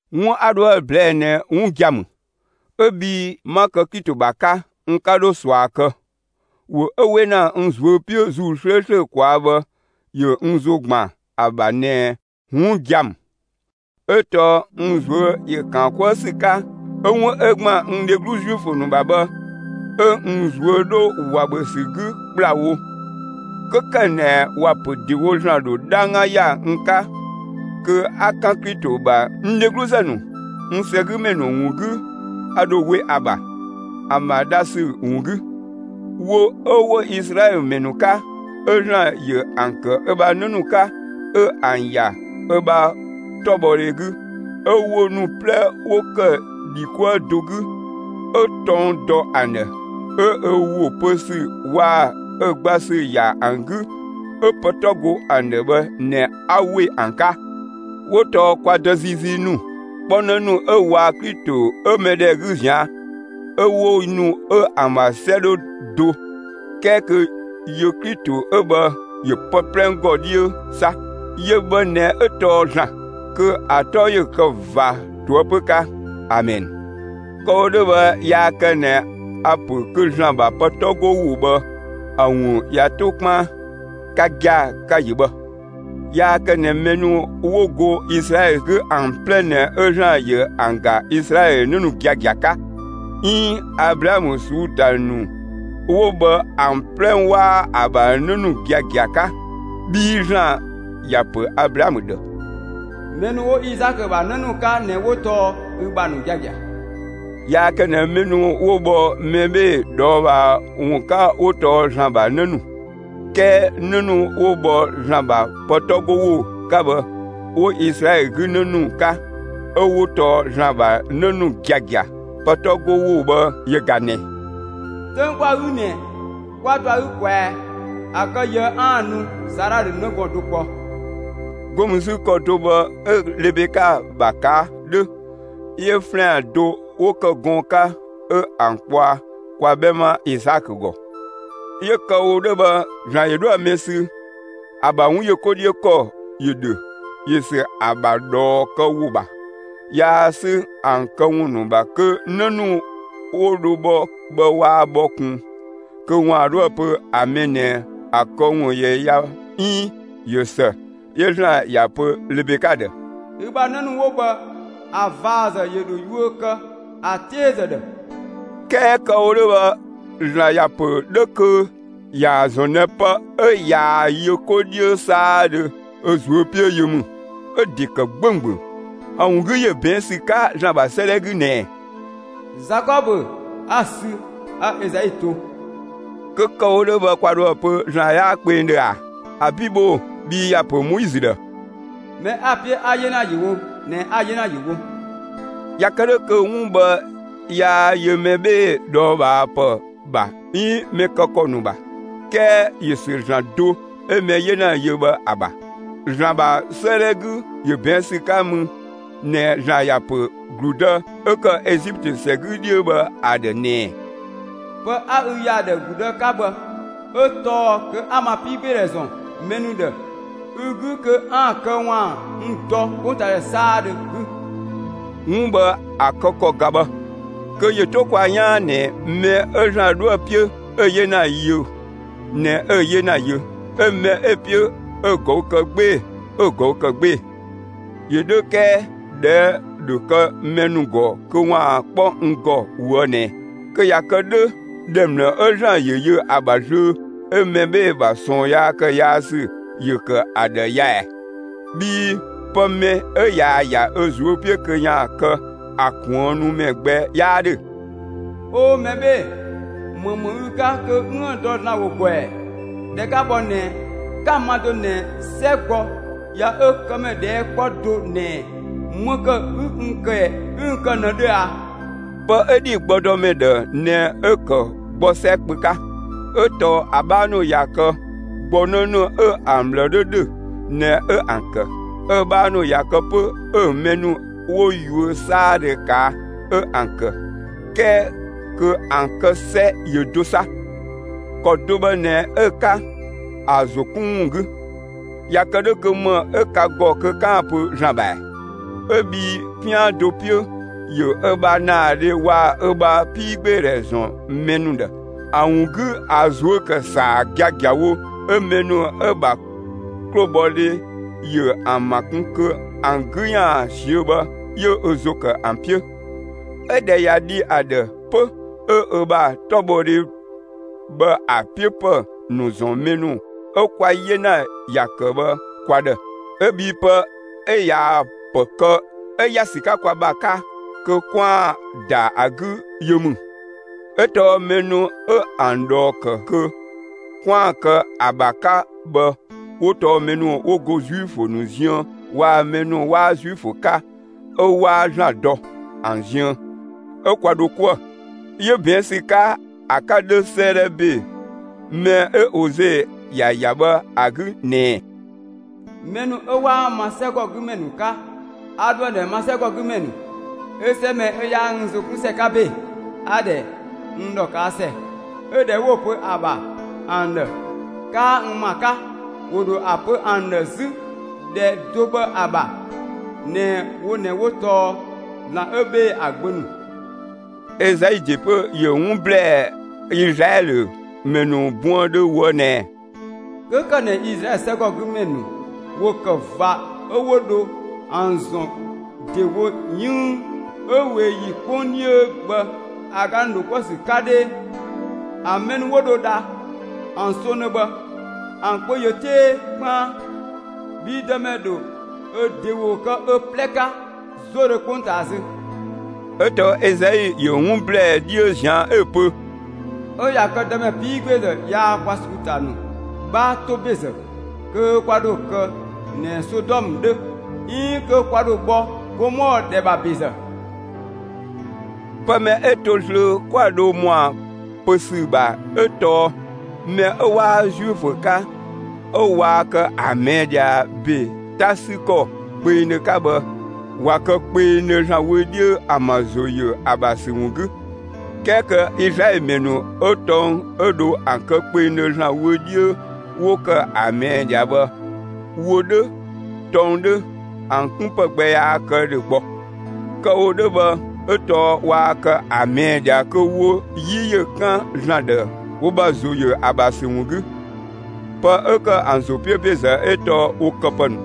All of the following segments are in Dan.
'Wun 'a 'dhoë‑ ꞊blɛɛ'‑ ꞊nɛ 'wun gia‑ ‑mü, 'ö bhii 'ma kë Klito ‑bha 'ka; n 'ka 'dho ꞊sua kë, ‑wo 'ö 'we ‑na n ꞊zuö' 'piö ‑Zuu 'slööslö ꞊kwaa' bhë ‑yö n ‑zo ‑gban ‑a ‑bha ꞊nɛ 'wun gia‑ ‑mü. 'Ö tɔɔ n ꞊zuö' ‑yö ‑kaan 'kuë ‑sü 'ka 'ö 'wun ('ö ‑gban n dheglu Zuifö ‑nu ‑bha bhë) 'ö n ꞊zuö' 'dhö ꞊wa ‑bhö ‑sü 'gü ‑kplawo. 'Kö ‑kë ꞊nɛ ‑wa ‑pö ‑dewo ‑Zlan ‑dho 'dhangga ‑ya n 'ka kö 'a 'kan Klito ‑bha n dhegluzë ‑nu, n ‑sɛgümɛ ‑nu ‑wun 'gü, a ‑dho we ‑a ‑bha, ‑an ‑bha dha ‑sü ‑wun 'gü. Wo 'ö 'wo Izlaɛlö ‑mɛ ‑nu 'ka, 'ö ‑Zlan ‑yö ‑an ‑kë ö ‑bha 'në ‑nu 'ka, 'ö ‑an ‑ya ö ‑bha 'tɔbhɔdhe 'gü, 'ö wo ‑nu 'plɛ 'wo ‑kë ‑dhi 'kuë do 'gü, 'ö tɔng dɔ ‑an ‑dhë, 'ö ö ‑wo pö ‑sü waa‑ ö gba ‑sü ‑ya ‑an 'gü, 'ö pë 'tɔ go ‑an ‑dhë bhë ꞊nɛ 'a ‑we ‑an 'ka. 'Wo tɔɔ kwa dë ziizii ‑nu 'kpɔ 'në ‑nu 'ö waa‑ Klito 'ö mɛbheedhɛ 'gü ꞊zian', 'ö wo ‑nu 'ö ‑an ‑bha 'sɛ 'dhö do 'kɛɛ kö yö Klito 'ö bhë ‑yö pë 'plɛ ‑gɔ 'dhiö 'sa; yö bhë ꞊nɛ 'ö tɔɔ ‑Zlan. Kö ‑a 'tɔ ‑yö kë ꞊va ꞊toëpö 'ka. Amɛn. Kë‑ wo 'dhö bhë yaa kë ꞊nɛ a‑ ‑pö kö ‑Zlan ‑bha pë 'tɔ go ‑wo bhë ‑a ‑wun ꞊ya 'to 'kpaan. Ka gia‑, ka‑ ‑yö bhë, yaa kë ꞊nɛ mɛ ‑nu 'wo go Izlaɛlö 'gü ‑an 'plɛ ꞊nɛ 'ö ‑Zlan ‑yö ‑an ‑ga Izlaɛlö 'në ‑nu giagia 'ka. 'Iin Ablaamö ꞊suu'‑ ‑ta ‑nu 'wo bhë ‑an 'plɛ 'waa ‑a ‑bha 'në ‑nu giagia 'ka bhii ‑Zlan ‑ya ‑pö Ablaamö ‑dhë: Mɛ ‑nu 'wo Izaakö ‑bha 'në ‑nu 'ka ꞊nɛ 'wo tɔɔ ü ‑bha ‑nu giagia. Yaa kë ꞊nɛ mɛ ‑nu 'wo bhɔ mɛ 'bhee‑ ꞊dhɔɔbhaa ‑wun 'ka 'wo tɔɔ ‑Zlan ‑bha ‑nu, 'kɛɛ 'në ‑nu 'wo bhɔ ‑Zlan ‑bha pë 'tɔ go ‑wo 'ka bhë 'wo Izlaɛlö 'gü 'në ‑nu 'ka, 'ö 'wo tɔɔ ‑Zlan ‑bha 'në ‑nu giagia. Pë 'tɔ 'go ‑wo bhë yö ꞊ga ꞊nɛɛ: 'Töng 'kwa‑ 'gü ꞊nɛ, ('kwa dɔ ‑a 'gü ꞊kwɛa,) ‑a kë ꞊yië' kö 'aan‑ nu, Saala dho 'në gɔɔn‑ do kpɔ. 'Go mü 'zü ‑kɔ do bhë 'ö Lebeka ‑bha ꞊kaa' 'dhö 'yö ‑flɛan do 'wo ‑kë gɔɔn‑ 'ka, 'ö ‑an kpɔa kwa 'bhɛma Izaakö ‑gɔ. 'Yö kë‑ wo 'dhö bhë, ‑Zlan ‑yö 'dhoë‑ mɛ sü, ‑a ‑bha 'wun ‑yö 'ko 'dhiö ‑kɔ ‑yö ‑dhö; ‑yö ‑sü ‑a ‑bha ꞊dhɔɔ kë ‑wo ‑bha; yaa 'sü ‑an këwun ‑nu ‑bha kö 'në ‑nu 'wo dho bhɔ bhë waa bhɔ kun, kö ‑waan 'dhoë‑ pö ‑a mɛ ꞊nɛ ‑a këwun ‑yö ya 'iin ꞊yö ‑së; 'yö ‑Zlan ‑ya pö Lebeka ‑dhë: Ü ‑bha 'në ‑nu 'wo bhë, ‑a ꞊vazë ‑yö ‑dho yuö kë ‑a 'teezë ‑dhë. 'Kɛɛ kë‑ wo 'dhö bhë, ‑Zlan ‑ya pö 'dhö kö ‑yaan ‑zɔn ꞊nɛ pë 'ö ꞊yaa‑ yö 'ko 'dhiö 'saadhö ö ꞊zuö' 'piö yö ‑mü; 'ö‑ ‑de ‑kë 'gbɛɛdhö. ‑A ‑wun 'gü, ‑yö ꞊bɛɛn' ‑sü 'ka ‑Zlan ‑bha 'sëëdhɛ 'gü ꞊nɛ: Zakɔbö 'a‑ sü; 'a Ezau to. Kö kë‑ wo 'dhö bhë kwa dhoë‑ pö ‑Zlan 'yaa kpengdhö ꞊a? ‑Abi' bhoo‑! Bhii ‑ya pö Moizö ‑dhë: Mɛ 'a‑ 'piö 'a‑ 'yena ‑yö wo ꞊nɛ 'a‑ 'yena ‑yö wo. ꞊Ya kë 'dhö kö 'wun bhë yaa yö mɛ 'bhee‑ ꞊dhɔɔbhaapë ‑bha 'iin mɛ kë ‑kɔ ‑nu ‑bha, 'kɛɛ ‑yö ‑sü ‑Zlan do 'ö mɛ 'yena yö bhë ‑a ‑bha. ‑Zlan ‑bha 'sëëdhɛ 'gü, ‑yö ꞊bɛɛn' ‑sü 'ka mü ꞊nɛ ‑Zlan ‑ya ‑pö ‑gludë 'ö ‑kë Ezitö ‑sɛgɔ 'dhiö bhë ‑a ‑dhë ꞊nɛ: Pë 'a ü ‑ya ‑a ‑dhë ‑gludë 'ka bhë 'ö tɔɔ kö 'a ma 'piigbeedhɛ ‑zɔn mɛ ‑nu ‑dhë ü 'gü kö 'aan‑ kë ‑waan n dɔ 'kpongtaadhɛ 'saadhö 'gü. 'Wun bhë ‑a kë ‑kɔ ꞊ga bhë; kö ‑yö 'to kwa 'yaan ꞊nɛ mɛ 'ö ‑Zlan 'dhoë‑ 'piö 'ö 'yena yö ꞊nɛ 'ö‑ 'yena yö, 'ö mɛ 'ö‑ 'piö 'ö‑ ꞊gɔü' kë 'gbee‑, 'ö‑ ꞊gɔü' ‑kë 'gbee‑. ‑Yö 'dhö 'kɛɛ ꞊dhɛɛ' ‑dhö kë mɛ ‑nu ‑gɔ kö ‑waan 'kpɔ n ‑gɔ ꞊woë' ꞊nɛ: «Kö ꞊ya kë 'dhö ‑dhɛ ‑mlë 'ö ‑Zlan ‑yö yö ‑a ‑bha zlöö 'ö mɛ 'bhee‑ ‑bha ꞊sɔɔn ‑kë yaa ‑sü ‑yö ‑kë ‑a ‑dhë ya ꞊ɛɛ? Bhii pë mɛ 'ö ꞊yaa‑ ‑ya ö ꞊zuö' 'piö kö ‑yaan kë, ‑a kuënnumɛ gbɛ 'yaa 'dhö.» 'Oo, mɛ 'bhee‑, ‑më ‑mü ü 'ka kö 'üën‑ dɔ ‑Zlan ‑wo ‑gɔ ‑ɛ? (꞊Dhɛ 'ka bhɔ ꞊nɛ) 'ka‑ ma do ꞊nɛ 'sɛ gbɔ ꞊ya ö këmɛ ꞊dhɛɛ' 'kpɔ do ꞊nɛ ‑më ‑kë 'ü n kë ꞊nëdhö ꞊a? Pë 'ö ‑dhi gbɔdɔmɛ ‑dhë ꞊nɛ 'ö‑ ‑kë gbɔ 'sɛ kpö 'ka; 'ö tɔɔ ‑a 'bhaa ‑nu ꞊ya kë, gbɔ 'në ‑nu 'ö ‑an ꞊bhlë 'dhö ‑dhö ꞊nɛ 'ö ‑an ‑kë, 'ö‑ 'bhaa ‑nu ꞊ya kë 'pö 'ö‑ mɛ ‑nu 'wo yuö 'saadhö ꞊kaa' 'ö ‑an ‑kë, 'kɛɛ kö ‑an kë ‑sɛ ‑yö do 'sa. ‑Kɔ do bhë ꞊nɛ 'ö‑ 'ka ‑a ‑zo 'kun ‑wun 'gü, ꞊ya kë 'dhö kö ‑më 'ö ka ‑gɔ kö 'kaan‑ pö ‑Zlan ‑bha ‑ɛ? 'Ö bhii 'pian do 'piö, ‑yö ö ‑bha ‑naadhe waa‑ ö ‑bha 'piigbeedhɛ ‑zɔn mɛ ‑nu ‑dhë; ‑a ‑wun 'gü, ‑a ꞊zuö' ‑kë ‑saa giagiawo, 'ö mɛ ‑nu 'ö‑ ‑bha 'klobhɔdhe ‑yö ‑an ‑ma kun kö ‑an 'gü ‑yaan ꞊siö'‑ bhë 'yö ö ‑zo ‑kë ‑an 'piö; 'Ö ꞊dhɛ ꞊ya dhi ‑a ‑dhë 'pö 'ö ö ‑bha 'tɔbhɔdhe bhë ‑a 'piö ‑pë ‑nu ‑zɔn mɛ ‑nu 'ö kwa 'yena ‑ya ‑kë bhë kwa ‑dhë. 'Ö bhii pë 'ö ꞊yaa‑ ‑pë kë 'ö ‑ya ‑sü 'ka kwa ‑bha 'ka kö 'kwaan‑ ‑da ‑a 'gü yö ‑mü. 'Ö tɔɔ mɛ ‑nu 'ö ‑an ꞊dhɔɔ ‑kë kö 'kwaan‑ kë ‑a ‑bha 'ka bhë 'wo tɔɔ mɛ ‑nu 'wo go Zuifö ‑nu ziën waa‑ mɛ ‑nu 'waa Zuifö 'ka 'ö 'waa ‑Zlan dɔ ‑an ziën, 'ö kwa dho 'kuë‑. 'Yö ꞊bɛɛn' ‑sü 'ka ‑a 'ka 'dhö 'sëëdhɛ ‑be mɛ 'ö Ose ‑ya ‑ya bhë ‑a 'gü ꞊nɛ: Mɛ ‑nu 'ö 'waa ma 'sɛgɔgümɛ ‑nu 'ka, a ‑dho ‑an ‑dhɛ ma 'sɛgɔgümɛ ‑nu, 'ö 'sɛ mɛ 'ö 'yaa n ‑zo 'kun ‑sɛ 'ka ‑be, 'a‑ ‑dhɛ n ‑dhɔ ꞊kaa' ‑sɛ. 'Ö ‑dhɛ 'wo‑ pö ‑a ‑bha ‑an ‑dhë: 'Kaa n ‑ma 'ka, 'wo dho ‑a pö ‑an ‑dhë 'zü ‑dhɛ do bhë ‑a ‑bha ꞊nɛ wo ꞊nɛ 'wo tɔɔ ‑Zlan 'ö 'bhee‑ ‑a gbö ‑nu. Ezai ‑de 'pö ‑yö 'wun ‑blɛɛ Izlaɛlö ‑mɛ ‑nu buëndhö ꞊woë' ꞊nɛ: 'Kö ‑kë ꞊nɛ Izlaɛlö 'sɛgɔgümɛ ‑nu ‑wo ‑kë ꞊va 'ö 'wo dho ‑an ‑zɔn ‑dewo 'yënng 'ö ꞊wee ‑yi 'kpong 'dhiö bhë ‑a ga ‑nu ‑dho 'kuë‑ ‑sü 'ka 'dhee, ‑an mɛ ‑nu 'wo dho dha ‑an songdhö bhë, ‑an kpö ‑yö 'tee 'kpaan; bhii Dëmɛ ‑dho ö ‑de ‑wo kë ö 'plɛ 'ka 'zodhö 'kpongtaa zö. 'Ö tɔɔ Ezai ‑yö 'wun ‑blɛɛ 'dhiö ꞊zian' 'ö‑ pö: 'Ö ꞊ya kë Dëmɛ 'piigbeezë yaa kwa ꞊suu'‑ ‑ta ‑nu 'bhaa 'to ‑bezë kö kwa ‑dho kë ꞊nɛ Sodɔmë 'dhö 'iin kö kwa ‑dho bhɔ Gomɔɔ ‑dhɛ ‑bha ‑bezë. Pë mɛ 'ö to zlöö 'kwa dho ‑mɔa pö ‑sü ‑bha 'ö tɔɔ: Mɛ 'ö 'waa Zuifö 'ka 'ö waa kë ‑a ꞊mɛɛ' ꞊dhia ‑be 'ta 'sü ‑kɔ kpengdhö 'ka bhë, ꞊wa kë kpengdhö ‑Zlan wö 'dhiö ‑an ‑bha ‑zo ‑yö ‑a ‑bha ‑sü ‑wun 'gü; 'kɛɛ kö Izlaɛlö ‑mɛ ‑nu 'ö tɔng 'ö dho ‑an kë kpengdhö ‑Zlan wö 'dhiö 'wo ‑kë ‑a ꞊mɛɛ' ꞊dhia bhë, wo 'dhö, tɔng 'dhö, ‑an 'kun ‑pë gbɛ yaa kë ‑dhö gbɔ. Kë‑ wo 'dhö bhë, 'ö tɔɔ waa kë ‑a ꞊mɛɛ' ꞊dhia, kö wo 'yi ‑yö 'kan ‑Zlan ‑dhë wo ‑bha ‑zo ‑yö ‑a ‑bha ‑sü ‑wun 'gü. Pë 'ö ‑kë ‑an ‑zo 'piö ‑bezë 'ö tɔɔ wo këpë ‑nu.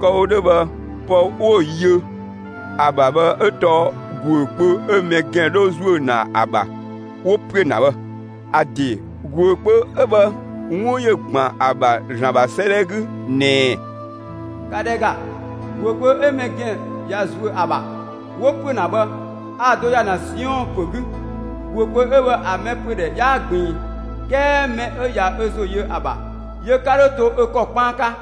Kë‑ wo 'dhö bhë, pë 'wo yö ‑a ‑bha bhë 'ö tɔɔ ‑guö kpö 'ö mɛ ‑gɛn 'dhö ‑zuö ‑na ‑a ‑bha, 'wo ‑püö ‑na bhë. ‑A ‑de, ‑guö kpö 'ö bhë, 'wun ‑yö ‑gban ‑a ‑bha ‑Zlan ‑bha 'sëëdhɛ 'gü ꞊nɛ: ‑Ka ‑dhɛ ‑ga! ‑Guö kpö 'ö mɛ ‑gɛn ꞊ya ‑zuö ‑a ‑bha 'wo ‑püö ‑na bhë, a‑ do ‑ya ‑na Siɔn ‑pö 'gü; ‑guö kpö 'ö bhë ‑a mɛ ‑püö ‑dhɛ 'yaa ꞊gbiin; 'kɛɛ mɛ 'ö ꞊ya ö ‑zo yö ‑a ‑bha, yö 'ka 'dho to ö ‑kɔ 'kpaan 'ka.